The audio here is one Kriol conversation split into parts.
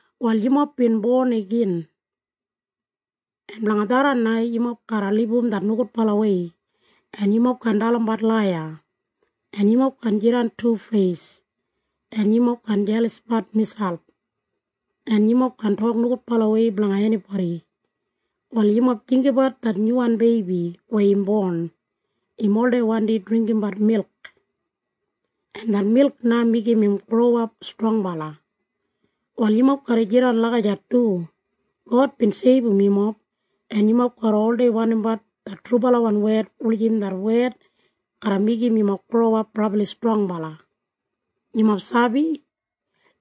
Wal yumob bin bon igin, en blanga tharran na yumob garra libum det nogudbalawei, en yumob kaan dalimbat laiya, en yumob kaan jidan tufeis, en yumob kaan jelasbat miselp, en yumob kaan tok nogudbalawei blanga enibodi. Wal yumob jinggabat det nyuwan beibi weya im bon. Im oldei wandi dringgimbat milk, en det milk na meigim im growap strongbala. Wal yumob garra jidan lagijat du. God bin seibum yumob, en yumob garra oldei wandimbat det trubalawan wed wulijim det wed garra meigim yumob growap brabli strongbala. Yumob sabi?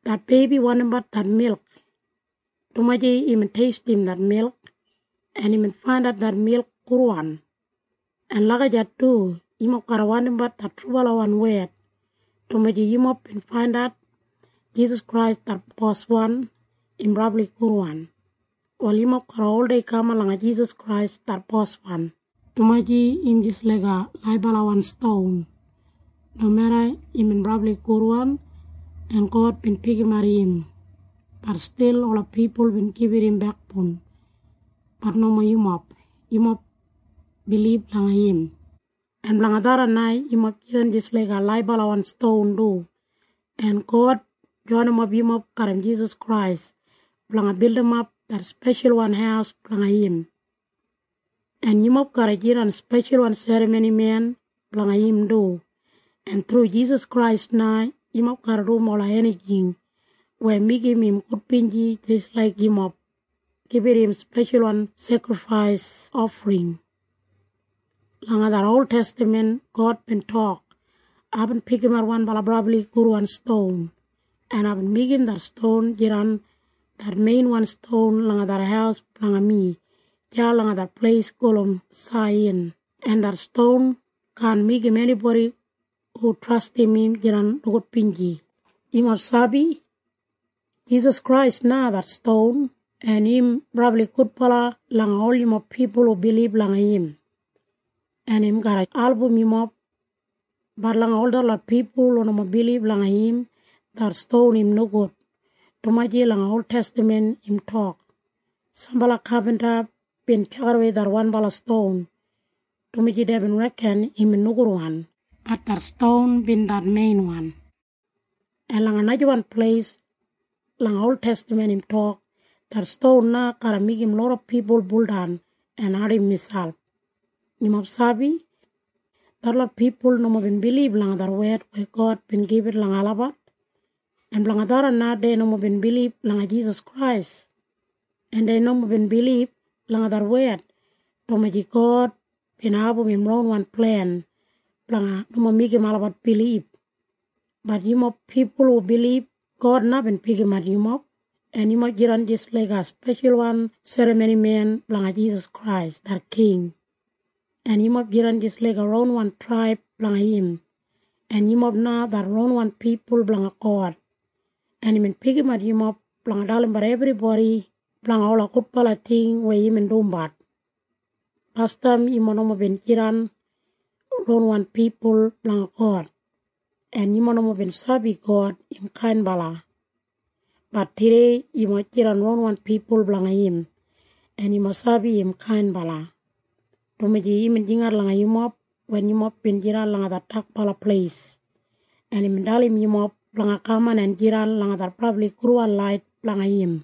Det beibi wandimbat det milk, dumaji imbin teistim det milk en imbin faindat det milk gudwan. En lagijat du yumob garra wandimbat det trubalawan wed, dumaji yumob bin faindat Jisas Krais det Boswan im brabli gudwan. Wal yumob garra oldei kaman langa Jisas Krais det Boswan, dumaji im jis laiga laibalawan ston. Nomeda imbin brabli gudwan en God bin pikimat im, bat stil ola pipul bin gibit im bekboun. Bat nomo yumob. Yumob bilib langa im. En blanga tharran na yumob jidan jis laiga laibalawan ston du, en God joinimap yumob garram Jisas Krais blanga bildimap det speshalwan haus blanga im, en yumob garra jidan speshalwan serramonimen blanga im du, en thru Jisas Krais na yumob garra dum ola enijing weya meigim im gudbinji jis laik yumob gibit im speshalwan sekrifais ofring. Langa det oltestaman God bin tok, “Aibin pikimat wanbala brabli gudwan ston, en aibin meigim det ston jidan det meinwan ston langa det haus blanga mi deya langa det pleis gulum Saiyan, en det ston kaan meigim enibodi hu trastim im jidan nogudbinji.” Yumob sabi? Jisas Krais na det ston, en im brabli gudbala langa ol yumob pipul hu bilib langa im, en im garra album yumob. Bat langa ol detlot pipul hu nomo bilib langa im, det ston im nogud, dumaji langa oltestaman im tok, “Sambala kapinta bin tjakidawei det wanbala ston, dumaji deibin reken imbin nogudwan. Bat det ston bin det meinwan.” En langa najawan pleis langa oltestaman im tok, “Det ston na garra meigim loda pipul buldan en ardim miselp.” Yumob sabi? Detlot pipul nomo bin bilib langa det wed weya God bin gibit langa olabat, en blanga tharran na dei nomo bin bilib langa Jisas Krais. En dei nomo bin bilib langa det wed, dumaji God bin abum im ronwan plen blanga nomo meigim olabat bilib. Bat yumob pipul hu bilib, God na bin pikimat yumob, en yumob jidan jis laiga speshalwan serramonimen blanga Jisas Krais det king, en yumob jidan jis laiga ronwan traib blanga im, en yumob na det ronwan pipul blanga God, en imbin pikimat yumob blanga dalimbat ebribodi blanga ola gudbala ting weya imbin dumbat. Basdam yumob nomo bin jidan ronwan pipul blanga God, en yumob nomo bin sabi God im kainbala. Bat tudei yumob jidan ronwan pipul blanga im, en yumob sabi im kainbala, dumaji imbin jingat langa yumob wen yumob bin jidan langa det dakbala pleis, en imbin dalim yumob blanga kaman en jidan langa det brabli gudwan lait blanga im.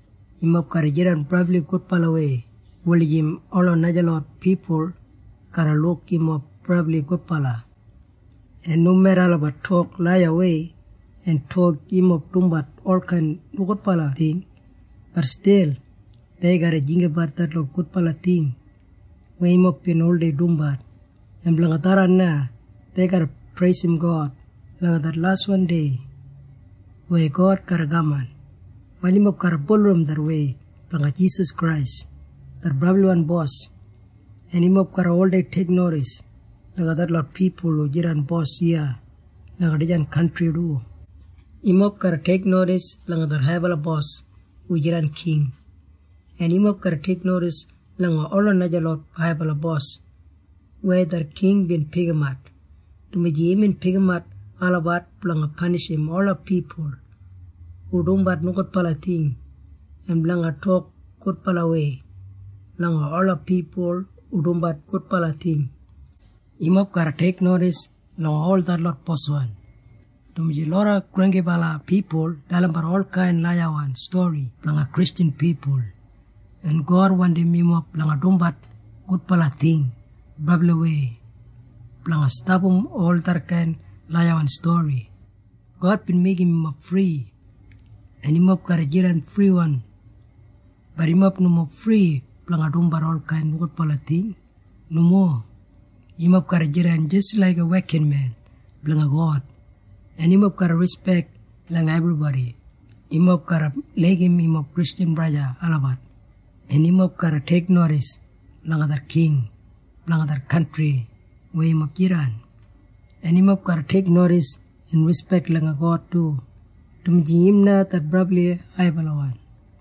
Yumob garra jidan brabli gudbalawei wulijim ola najalot pipul garra luk yumob brabli gudbala, en nomeda olabat tok laiyawei en tok yumob dumbat olkain nogudbala ting, bat stil dei garra jinggabat detlot gudbala ting weya yumob bin oldei dumbat, en blanga tharran na dei garra preisim God langa det laswan dei weya God garra kaman. Praise Wal yumob garra bulurrum det wei blanga Jisas Krais det brabliwan Bos, en yumob garra oldei teiknodis langa detlot pipul hu jidan bos iya langa dijan kantri du. Yumob garra teiknodis langa det haibala bos hu jidan king, en yumob garra teiknodis langa ola najalot haibala bos weya det king bin pikimat, dumaji imbin pikimat olabat blanga panishim ola pipul hu dumbat nogudbala ting en blanga tok gudbalawei langa ola pipul hu dumbat gudbala ting. Yumob garra teiknodis langa ol detlot boswan, dumaji loda granggibala pipul dalimbat olkain laiyawan stori blanga Kristjan pipul, en God wandim yumob blanga dumbat gudbala ting brabliwei blanga stapam ol detkain laiyawan stori. God bin meigim yumob fri, en yumob garra jidan friwan. Bat yumob nomo fri blanga dumbat olkain nogudbala ting. Nomo. Yumob garra jidan jis laiga wekinmen blanga God, en yumob garra rispek langa ebribodi. Yumob garra laigim yumob Kristjan braja en sista olabat, en yumob garra teiknodis langa det king blanga det kantri weya yumob jidan, en yumob garra teiknodis en rispek langa God du, dumaji im na det brabli haibalawan.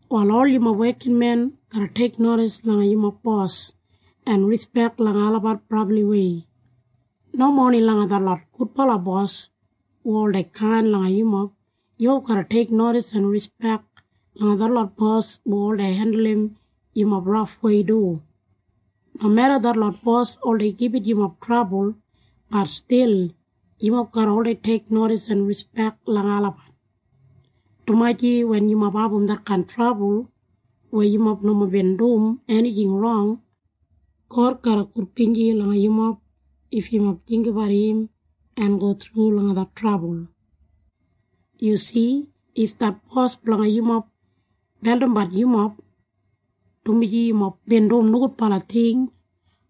Wal ol yumob wekinmen garra teiknodis langa yumob bos en rispek langa olabat brabliwei. Nomo oni langa detlot gudbala bos hu oldei kain langa yumob. Yumob garra teiknodis en rispek langa detlot bos hu oldei hendulum yumob rafwei du. Nomeda detlot bos oldei gibit yumob trabul, bat stil yumob garra oldei teiknodis en rispek langa olabat, dumaji wen yumob abum detkain trabul weya yumob nomo bin dum enijing rong, God garra gudbinji langa yumob if yumob jinggabat im en go thru langa det trabul. Yu si? If det bos blanga yumob beldimbat yumob, dumaji yumob bin dum nogudbala ting,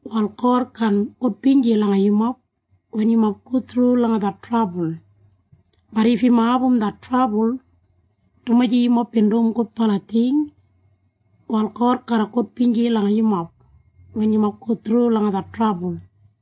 wal God kaan gudbinji langa yumob wen yumob go thru langa det trabul. Bat if yumob abum det trabul, dumaji yumob bin dum gudbala ting, wal God garra gudbinji langa yumob wen yumob go thru langa det trabul.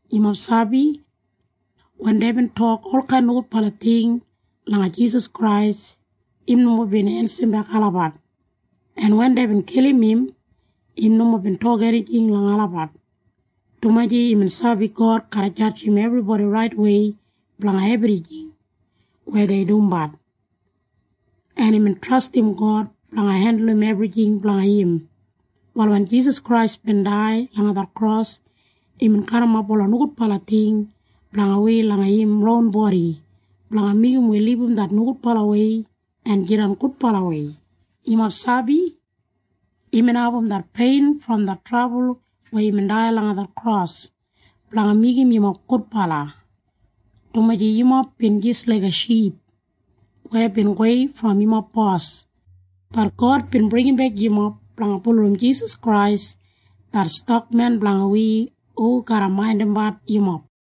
Yumob sabi? Wen deibin tok olkain nogudbala ting langa Jisas Krais, im nomo bin ensimbek olabat. En wen deibin kilim im, im nomo bin tok enijing langa olabat, dumaji imbin sabi God garra jadjim ebribodi raitwei blanga ebrijing weya dei dumbat, en imbin trastim God blanga hendulum ebrijing blanga im. Wal wen Jisas Krais bin dai langa det kros, imbin garrimap ola nogudbala ting blanga wi langa im ron bodi blanga meigim wi libum det nogudbalawei en jidan gudbalawei. Yumob sabi? Imbin abum det pein brom det trabul weya imbin dai langa det kros blanga meigim yumob gudbala, dumaji yumob bin jis laiga ship weya bin gowei brom yumob bos. Bat God bin bringimbek yumob blanga bulurrum Jisas Krais det Stakmen blanga wi hu garra maindimbat yumob.